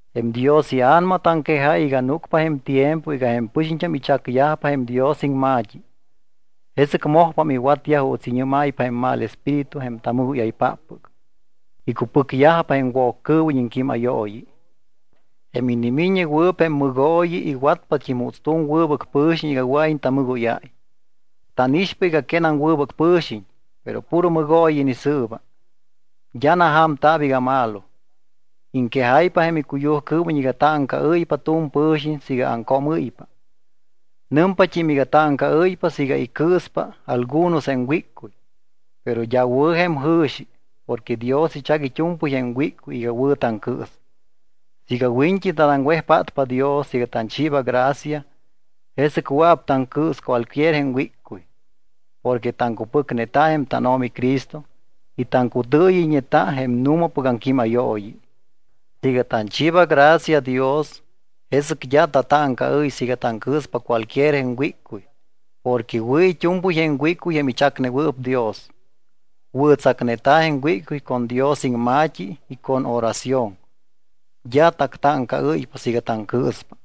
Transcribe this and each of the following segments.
Jém Dios iA̱nama taŋquejáy iga núcpa jém tiempo iga jém pɨxiñt́am ichacyajpa jém Dios iŋma̱t́i. Jesɨc mojpam iwatyaj juuts iñɨ́máypa jém mal espíritu jém tamɨgóyaypáppɨc. Icupɨcyajpa jém Woccɨɨwiñ iŋquímayooyi. Jém inimiññewɨɨp jém mɨgooyi iwatpat́im juuts tu̱m wɨbɨc pɨ̱xiñ iga wɨa̱iñ tamɨgóyáy. Tánixpa iga quénam wɨbɨc pɨ̱xiñ, pero puro mɨgooyi inisɨɨba. D́a naja̱mta̱p iga malo. Iŋquejáypa jém icuyujcɨɨwiñ iga táŋcaɨ́ypa tu̱m pɨxiñ siiga aŋcoomɨ́ypa. Nɨmpat́im iga táŋcaɨ́ypa siiga icɨɨspa algunos jém wíccuy. Pero d́a wɨ̱ jém jɨ̱xi porque Dios ichac it́u̱mpɨy jém wíccuy iga wɨ̱ taŋcɨɨs. Siiga wiñt́i tanaŋwejpátpa Dios iga tanchiiba gracia, jesɨc wɨa̱p taŋcɨɨs cualquier jém wíccuy. Porque taŋcupɨcneta jém tánO̱mi Cristo y taŋcutɨɨyɨyñeta jém nu̱mapɨc aŋquímayooyi. Siiga tanchiiba gracia Dios, jesɨc d́a tatáŋcaɨ́y siiga taŋcɨɨspa cualquier jém wíccuy porque wɨ̱ it́u̱mpɨy jém wíccuy jém ichacnewɨɨp Dios. Wɨ̱tsacneta̱ jém wíccuy con Dios iŋma̱t́i y con oración, d́a tactáŋcaɨ́ypa siiga taŋcɨɨspa.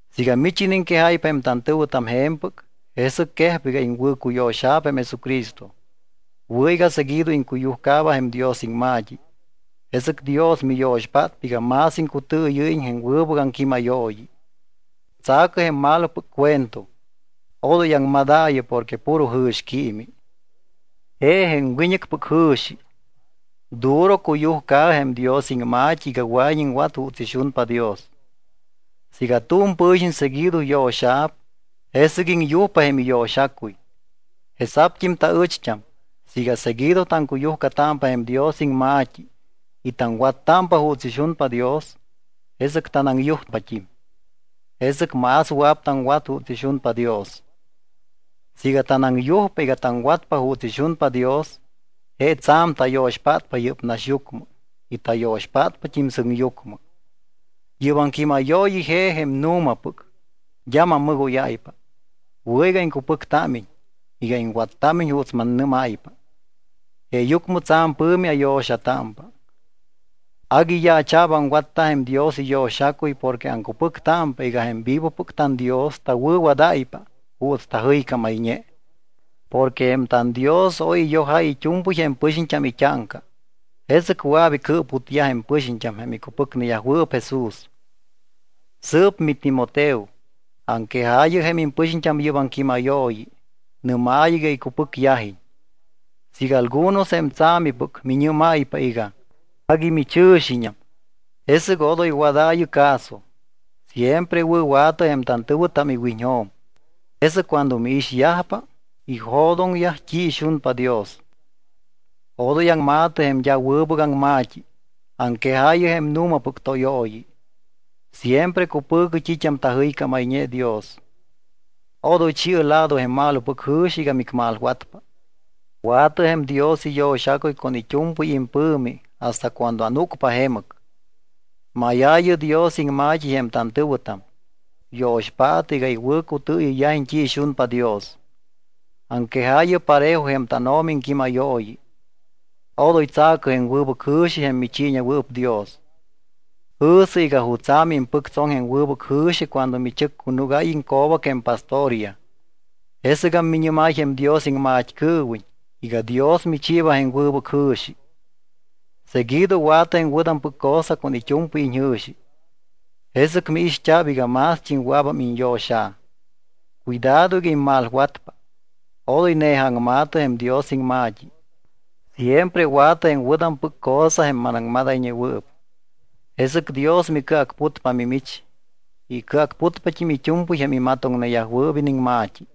Siiga mich iniŋquejáypa jém tantɨ̱wɨtam je̱mpɨc, jesɨc quejpa iga iŋwɨ̱cuyo̱xa̱p jém Jesucristo. Wɨ̱ iga seguido iŋcuyujcaaba jém Dios iŋma̱t́i, jesɨc Dios miyo̱xpátpa iga más iŋcutɨɨyɨ́yiñ jém wɨbɨc aŋquímayooyi. Tsa̱cɨ jém malopɨc cuento, odoy aŋmadaayɨ porque puro jɨ̱xquiimi. Je jém wiñɨcpɨc jɨ̱xi. Duro cuyujcaɨ jém Dios iŋma̱t́i iga wɨa̱iñ iŋwat juuts ixunpa Dios. Siiga tu̱m pɨ̱xiñ seguido yo̱xa̱p, jesɨc iŋyujpa jém iyo̱xacuy. Jesa̱pt́im taɨcht́am, siiga seguido taŋcuyujcatámpa jém Dios iŋma̱t́i y taŋwattámpa juuts ixunpa Dios, jesɨc tanaŋyujpat́im. Jesɨc más wɨa̱p taŋwat juuts ixunpa Dios. Siiga tanaŋyujpa iga taŋwatpa juuts ixunpa Dios, je tsa̱m tayo̱xpátpa yɨ́p naxyucmɨ y tayo̱xpátpat́im sɨŋyucmɨ. Yɨ́p aŋquímayooyi je jém nu̱mapɨc, d́a mammɨgóyáypa. Wɨ̱ iga iŋcupɨctámiñ, iga iŋwattámiñ juuts mannɨ́máypa. Jeeyucmɨ tsa̱m pɨ̱mi ayo̱xatámpa, agui yaacha̱p aŋwatta jém Dios iyo̱xacuy porque aŋcupɨctámpa iga jém vivopɨc tanDios tawɨ̱wadáypa juuts tajɨycámayñe. Porque jém tanDios oy iyojáy it́u̱mpɨy jém pɨxiñt́am it́áŋca, jesɨc wɨa̱p icɨɨputyaj jém pɨxiñt́am jém icupɨcneyajwɨɨp Jesús. Sɨɨp miTimoteo, aŋquejaayɨ jém impɨxiñt́am yɨ́p aŋquímayooyi. Nɨ́maayɨ iga icupɨcyajiñ. Siiga algunos jém tsa̱mipɨc miñɨ́mayyajpa iga: Agui michɨ̱xiñam, jesɨc odoy wadaayɨ caso. Siempre wɨ̱wa̱tɨ jém tantɨ̱wɨtam iwiñjo̱m, jesɨc cuando miixyajpa, ijo̱doŋyaj t́i ixunpa Dios. Odoy aŋma̱tɨ jém d́a wɨbɨc aŋma̱t́i. Aŋquejaayɨ jém nu̱mapɨc tóyooyi. Siempre cupɨ̱cɨ t́it́am tajɨycámayñe Dios. Odoy chi̱ɨ lado jém malopɨc jɨ̱xi iga micmalwatpa. Wa̱tɨ jém Dios iyo̱xacuy con it́u̱mpɨy impɨ̱mi hasta cuando anúcpa jemɨc. Máyaayɨ Dios iŋma̱t́i jém tantɨ̱wɨtam. Yo̱xpaatɨ iga iwɨ̱cutɨɨyɨyyajiñ t́i ixunpa Dios. Aŋquejaayɨ parejo jém tánO̱mi iŋquímayooyi. Odoy tsa̱cɨ jém wɨbɨc jɨ̱xi jém michiiñewɨɨp Dios. Jɨ̱sɨ iga jutsa̱ miimpɨctsoŋ jém wɨbɨc jɨ̱xi cuando michɨccunugáy iŋco̱bac jém pastoryaj. Jesɨgam miñɨ́máy jém Dios iŋmat́cɨɨwiñ iga Dios michiiba jém wɨbɨc jɨ̱xi. Seguido wa̱tɨ jém wɨ̱tampɨc cosa con it́u̱mpɨy iñjɨ̱xi, jesɨc miixt́a̱p iga mást́im wɨa̱bam iñyo̱xa̱. Cuidado iga immalwatpa. Odoy ne̱ja aŋma̱tɨ jém Dios iŋma̱t́i. Siempre wa̱tɨ jém wɨ̱tampɨc cosa jém manaŋmadayñewɨɨp. Jesɨc Dios micɨacputpa mimich y icɨacputpat́im it́u̱mpɨy jém imatoŋneyajwɨɨp iniŋma̱t́i.